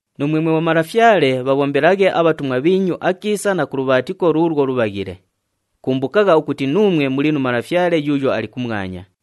Nuumwe mwe bhomalafyale, bhabhombelaghe abhatumwa bhiinyu akiisa na ku lubhaatiko luulwo lubhaghile. Kumbukagha ukuti nuumwe muli nu Malafyale yuuyo ali kumwanya.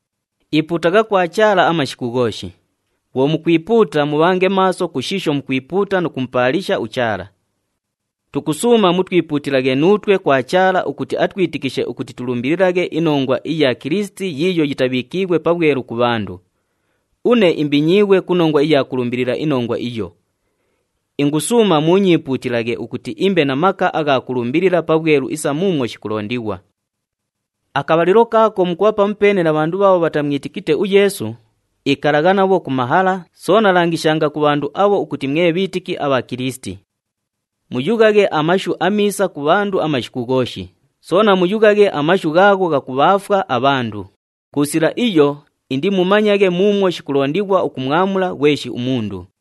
Ipuutagha kwa Chaala amashiku ghooshi. Bhwo mukwipuuta, mubhange maaso ku shiisho mukwipuuta nu kumupaalisha uChaala. Tukusuuma mutwipuutilaghe nuutwe kwa Chaala ukuti atwitikishe ukuti tulumbililaghe inongwa iya Kilisiti yiiyo yitabhiikiighwe pabhwelu ku bhandu. Une imbinyiighwe ku nongwa iya kulumbilila inongwa iyo. Ingusuuma muunyiipuutilaghe ukuti imbe na maka agha kulumbilila pabhwelu isa muumwo shikulondighwa. Akabhalilo kaako mukubha pamupeene na bhandu bhaabho bhatamwitikite uYeesu, ikalagha nabho ku mahala, soona langishanga ku bhandu abho ukuti mwe bhiitiki abha Kilisiti. Muyughaghe amashu amiisa ku bhandu amashiku ghooshi, soona muyughaghe amashu ghaagho ghakubhaafwa abhandu. Ku sila iyo, indimumanyaghe muumwo shikulondighwa ukumwamula ghweshi umundu.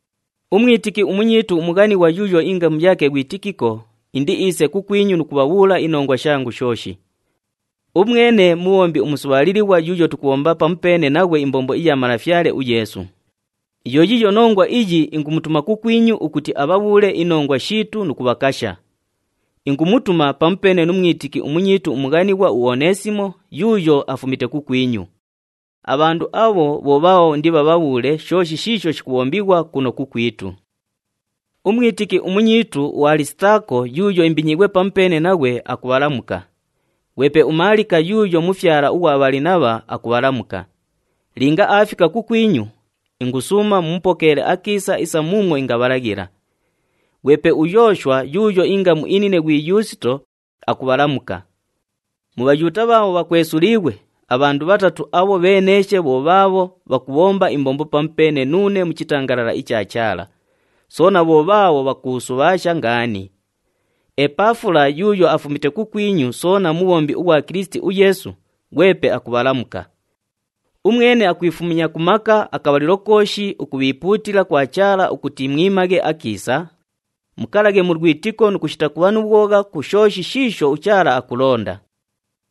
Umwitiki umunyiitu umughanighwa yuuyo ingamu yaake ghwi Tikiko, indiiise kukwinyu nu kubhabhuula inongwa shangu shooshi. Umwene mubhombi umusubhaalilighwa yuuyo tukubhomba pamupeene naghwe imbombo iya Malafyale uYeesu. Yo yiiyo nongwa iyi ingumutuma kukwinyu ukuti abhabhuule inongwa shiitu nu kubhakasha. Ingumutuma pamupeene nu mwitiki umunyiitu umughanighwa uOneesimo yuuyo afumite kukwinyu. Abhandu abho bho bhaabho indibhabhabhuule shooshi shiisho shikubhombighwa kuno kukwitu. Umwitiki umunyiitu uAlisitaako yuuyo imbinyiighwe pamupeene naghwe, akubhalamuka. Ghwepe uMaalika yuuyo mufyala ughwa Bhalinabha, akubhalamuka. Linga aafika kukwinyu, ingusuuma mumupokeele akiisa isa muumwo ingabhalaghila. Ghwepe uYooshwa yuuyo ingamu inine ghwi Yuusito, akubhalamuka. Mu Bhayuuta bhaabho bhakwesuliighwe, abhandu bhatatu abho bheeneeshe bho bhaabho bhakubhomba imbombo pamupeene nuune mu chitangalala icha Chaala. Soona bho bhaabho bhakuusubhaasha ngaani. UEpafula yuuyo afumite kukwinyu soona mubhombi ughwa Kilisiti uYeesu, ghwepe akubhalamuka. Umwene akwifumya ku maka akabhalilo kooshi ukubhiipuutila kwa Chaala ukuti mwimaghe akiisa, mukalaghe mu lwitiko nu kushita kubha nu bhwogha ku shooshi shiisho uChaala akulonda.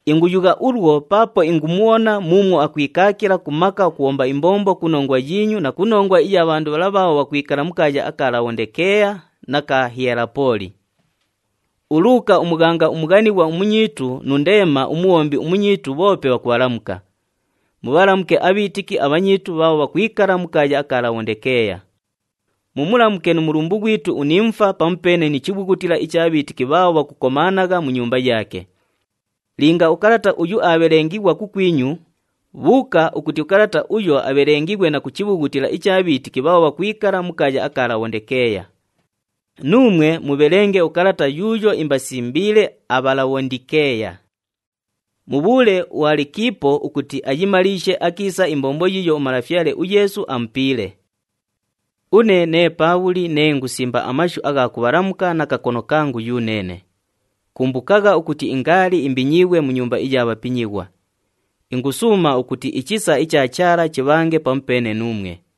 Inguyugha ulwo paapo ingumubhona muumwo akwikaakila ku maka ukubhomba imbombo ku nongwa yiinyu na ku nongwa iya bhandu bhala bhaabho bhakwikala mu kaaya aka Labhondikeeya na ka Hiyelapooli. ULuuka umughanga umughanighwa umunyiitu nu Ndeema umubhombi umunyiitu bhoope bhakubhalamuka. Mubhalamuke abhiitiki abhanyiitu bhaabho bhakwikala mu kaaya aka Labhondikeeya. Mumulamuke nu mulumbu ghwitu uNimufa pamupeene ni chibhughutila icha bhiitiki bhaabho bhakukomaanagha mu nyumba yaake. Linga ukalata uyu aabhelengighwa kukwinyu, bhuuka ukuti ukalata uyo abhelengighwe na ku chibhughutila icha bhiitiki bhaabho bhakwikala mu kaaya aka Labhondikeeya. Nuumwe mubhelenge ukalata yuuyo imbasimbiile aBhalabhondikeeya. Mubhuule uAlikiipo ukuti ayimaliishe akiisa imbombo yiiyo uMalafyale uYeesu amupiile. Une nee Paabhuli nee ingusimba amashu agha kubhalamuka na kakono kangu yuneene. Kumbukagha ukuti ingaali imbinyiighwe mu nyumba iya bhapinyighwa. Ingusuuma ukuti ichisa icha Chaala chibhange pamupeene nuumwe.